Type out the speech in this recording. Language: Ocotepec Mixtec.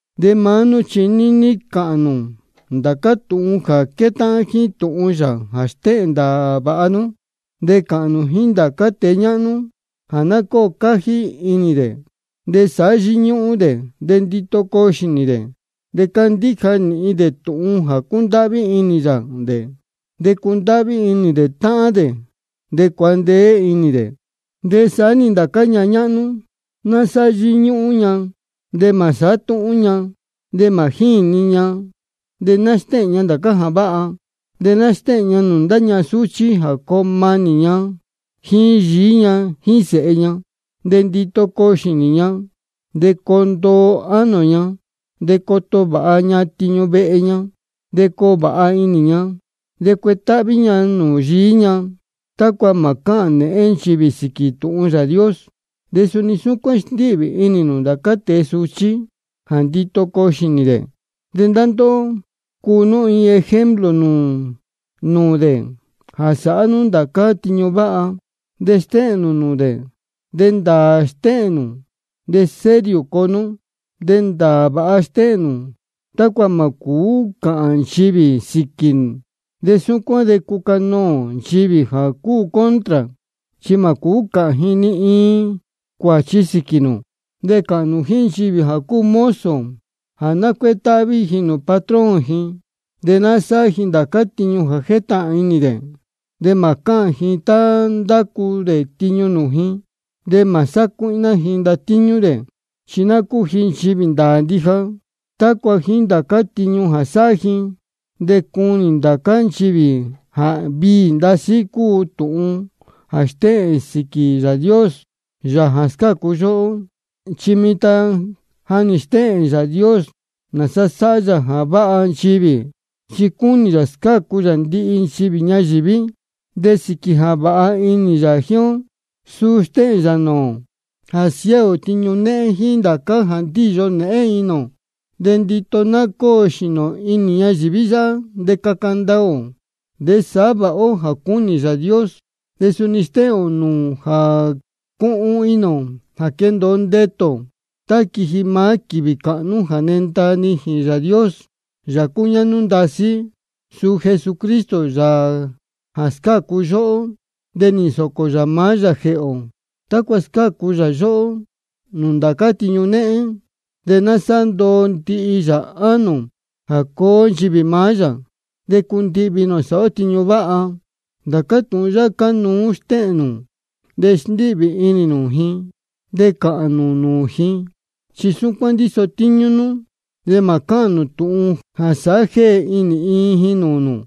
De maá nú chi níní cāhān nū ndācá tūhun jā quétáhán jíín tūhun yā jā stéhēn ndāā vāha. De cāhān nū jíín ndācá tēe ñáhnú jā ná cóo cájí inī dē, de sāhá yíñúhún dē, de ndito coo xīnī dē, de candíja nīhin dē tūhun jā cúndáhví inī yā dē, de cundáhví inī dē táhán dē, de cuandeé inī dē. De saá-ni ndācá ñahan ñáhnú, ná sáhá yíñúhún ña, de mā sāhá túhún ña, de mā jíni ña. De ná stéhēn ña ndācá jā váha. De ná stéhēn ña nūū ndá ñahan súchí jā coo manī ña jíín yií ña jíín sēhe ña. De ndito coo xīnī ña, de coo ndoo ánō ña, de coto vāha ña tiñu vehe ña, de coo vāha inī ña, de cuetáhví ña nūū yií ña, tácua mā cáhān nēhén nchivī sīquī tūhun Yāā Dios. De suni súcuán sndíhvī inī nū ndācá tēe suchí jā ndito coo xīnī dē. De ndóhó, cuu nú iin ejemplo nūū dē jā sāhá nú ndācá tiñu váha. De tá stéhēn nū nūū dē de ndāā stéhēn nū de serio coo nú. De ndāā vāha stéhēn nū, tácua mā cūú cāhān nchivī sīquī. De súcuán de cucanoō nchivī jā cúu contra, chi mā cūú cāhān ji ni iin cuāchi sīquī nū. De cāhān nū jíín nchivī jā cúu mozo jā ná cuétáhví ji nūū patrón ji, de ná sáhá ji ndācá tiñu jā jétahān inī dē, de mā cáhān ji tá ndacu dē tiñu nūū ji. De mā sácuíhná ji ndatíñú dē, chi ná cúu ji nchivī ndāā ndija, tácua jíín ndācá tiñu jā sáhá ji, de cunī ndācá nchivī jā viī ndasí cúu tūhun jā stéhēn sīquī Yāā Dios, Yāā jā scácu yóhó. Chi mitan ja nī stéhēn Yāā Dios nāsa sáhá yā jā váha nchivī, chi cúnī yā scácu yā ndihi nchivī ñayīví. De sīquī jā vāha inī yā jíín ó, suu stéhēn nūū ō jā siáā ō tiñu néhén jíín ndācá jā ndíyo nēhén inī ō. De ndito ná cóo xīnī ō inī ñayīví yáhá, de caca ndaā ō, de sāhá vāha ó jā cúnī Yāā Dios. De suni stéhēn nūū ō jā cuhun inī ō jā quendōo ndetū ō tá quiji maá quīvī cāhnú jā nenda nijīn Yāā Dios, Yāā cúñáhnú ndasí, suu Jesucristo, Yāā jā scácu yóhó. Chi nī nsōcō yā maá yā jēhē ō, tácua scácu yā yóhó nūū ndācá tiñu néhén, de sāhá ndoo ndihi yā ánō ō jā cuu ó nchivī maá yā, de cundihvī inī ō sāhá ó tiñu váha. Ndācá tūhun yáhá cánuú stéhēn nū, de sndíhvī inī nū ji, de cāhān nū nūū ji, chi súcuán ndíso tíñú nú. De mā cuáha nú tūhun jā sāhá jéhe inī ni iin ji nūū nū.